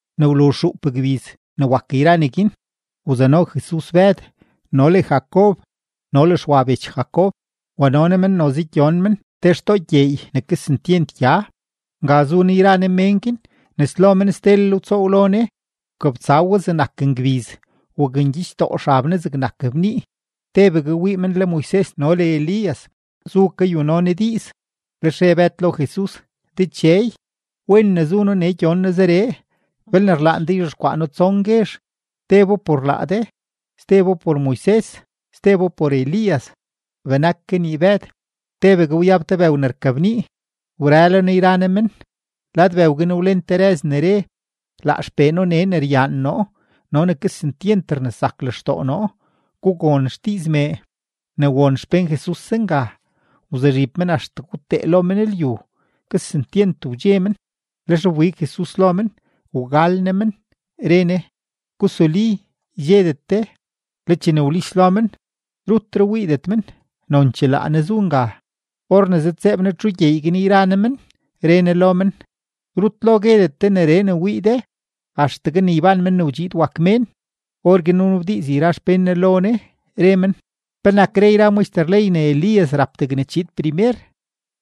Ne wluzh xuup gbiz ne wak yra neguin, wzano Jesus Bëd no le Jacob no le Xwa bech Jacob, wano Ne men noze gyon men te xtoo gyeey ne kesentyent gya. Nga zu Ne yra Ne mén guin, nes lo men stelel wtsoow lo Ne; wkabtsa we zegnak ngbiz, wakngyichdoo xab Ne zegnak bnii. Tebegue wii men le Moises no le Elías zu kayuno Ne diiz. Lex re Bëd lo Jesus: ―Dechey, ¡wen ne zu noo nee gyon noo zeree! Belne rlaan de, yzhexkwaa noo tson guezh: tebo por laa de, stebo por Moises, stebo por Elías. Benak kanii Bëd, tebegue wyab te bëw ne rkabnii wrëlo Ne yra Ne men; lad bëw guin wlen te rëz ne re: ―Laa XPee noo nee ne ryaan noo no ne kesentyent rnesak lextoo noo; gugon xdiiz mee. Ne won xpén Jesus zenga, wzuzhib men axtegue wtee lo men lyu, kesentyent wdxe men. Lex wbig Jesus lo men, wgal Ne men, re Ne: ―Gusuli; ydxedet de. Le chene wlis lo men, rutre wiidet men, nonchee laa Ne zu nga. Or ne zëdtseeb Ne txu gyeey guin yra Ne men, re Ne lo men: ―Rut lo guedetgue de neree ne wii de axtegue ne yban Men ne wdxiid wak Mén. Orguin wnabdiiz yra xpén Ne lo Ne, re men: ―¿Penak re yra maxter ley ne laa Elías rap degne chiid primer?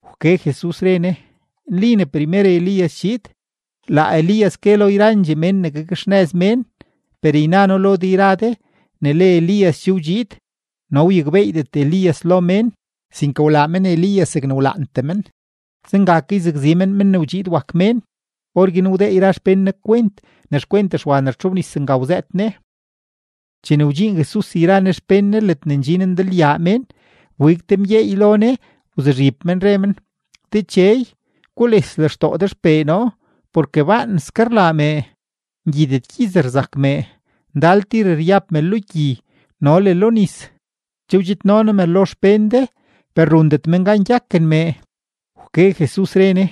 Wke Jesus, re Ne: ―Nli ne primer Elías chiid; laa Elías gue lo yrandxee mén ne gakxnëz mén. Per yna noo lo de yra de ne le Elías che wdxiid, no wyakbeeydet Elías lo mén, sinke wlaa men Elías zegne wlaantee men. Zenga ke yzakzi men Men ne wdxiid wak Mén. Orguin wdee yra xpén Ne kwent ne xkwent Xwa ne rtxobnis nga wzëët Ne. Chene wdxiin Jesus yra Ne xpén Ne ledne ndxin ndalyaa mén, wbig te mgyeey lo Ne wzuzhib men, re men: ―Dechey, gules lextoo de xpee noo porke baanske rlaa mee, ngyidet gyiz rzak mee, ndal tir ryab me lo gyi no le lo nis. Che wdxidno noo me lo xpén de, per rundet men gan gyaken mee. Wke Jesus, re Ne: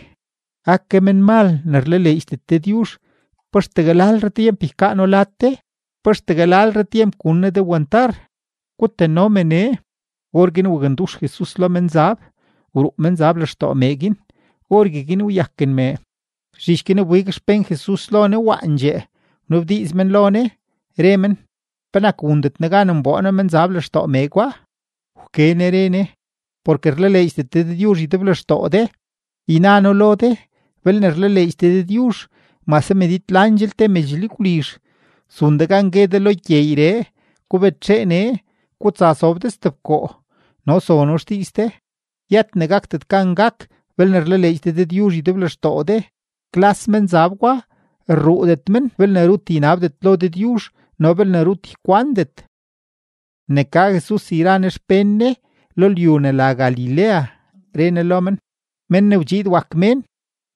―¡Ake menmal ne rlaleedxdet Dëdyuzh! ¿Pa axtegue lalre tyemp ykaa noo lad de? ¿Pa axtegue lalre tyemp gun noo de wantar? Gutano me nee. Orguin wakndux Jesus lo menzab, wruu menzab lextoo mee guin, orgueguin wyaken mee. Zhich guin wbig xpén Jesus lo Ne waandxee, wnabdiiz men lo Ne, re men: ―¿Penak wundet noo gan nboo noo menzab lextoo mee gwa? Wke Ne re Ne: ―Porke rlaleedxdet de Dëdyuzh ydeblextoo de. Yna noo lo de belne rlaleedx de Dëdyuzh mase medid landxel te medx lyagwlizh, zun de gan gue de lo gyeeyree: “Gubetxee nee, gutsa sob de stebkoo”, no zono xdiiz de. Yët ne gakdet gan gak belne rlaleedx de Dëdyuzh ydeblextoo de. Klas menzab gwa rruudet men belne rut ynabdet lo Dëdyuzh no belne rut ykwandet. Ne ka Jesus yra Ne xpén Ne lo lyu ne la Galilea, re Ne lo men: ―Men ne wdxiid wak Mén,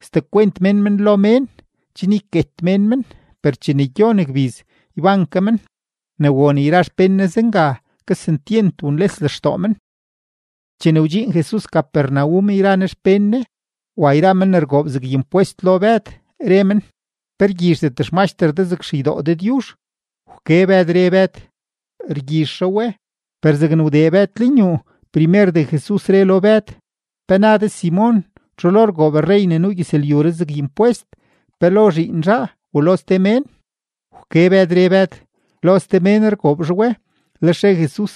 sdekwent mén men lo mén chen yket mén men; per chene gyon gbiz, yban ke men. Ne won yra xpén Ne zenga, kesentyent wunles lextoo men. Chene wdxiin Jesus Capernaum yra Ne xpén Ne, wa yra men ne rgoob zeg impwest lo Bëd, re men: ―¿Pe rgyizhdet xmaxter de zeg xeydoo Dëdyuzh? Wke Bëd, re Bëd: ―Rgyizh zhaa we. Per zegne wdee Bëd lenyuu, primerdee Jesus re lo Bëd: ―¿Pe na de Simon? ¿Txu lo rgoob rrey ne nuu gyëzlyuree zeg impwest, pe lo zhiin zhaa u lo ste mén? Wke Bëd, re Bëd: ―Lo ste mén rgoob zhaa we. Lex re Jesus: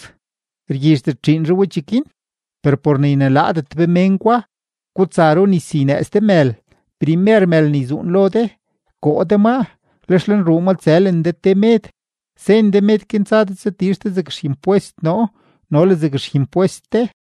―Rgyizhdet zhiin zhaa we cheguin. Per por ne ynelaadet be mén gwa, gutsa runis ynëëz de mël. Primer mël ne yzuun lo de, koo de maa, lex lenruu ma tsëlen de te med, sen de med guin tsa de tsatizh de zeg ximpwest noo no le zeg ximpwest de.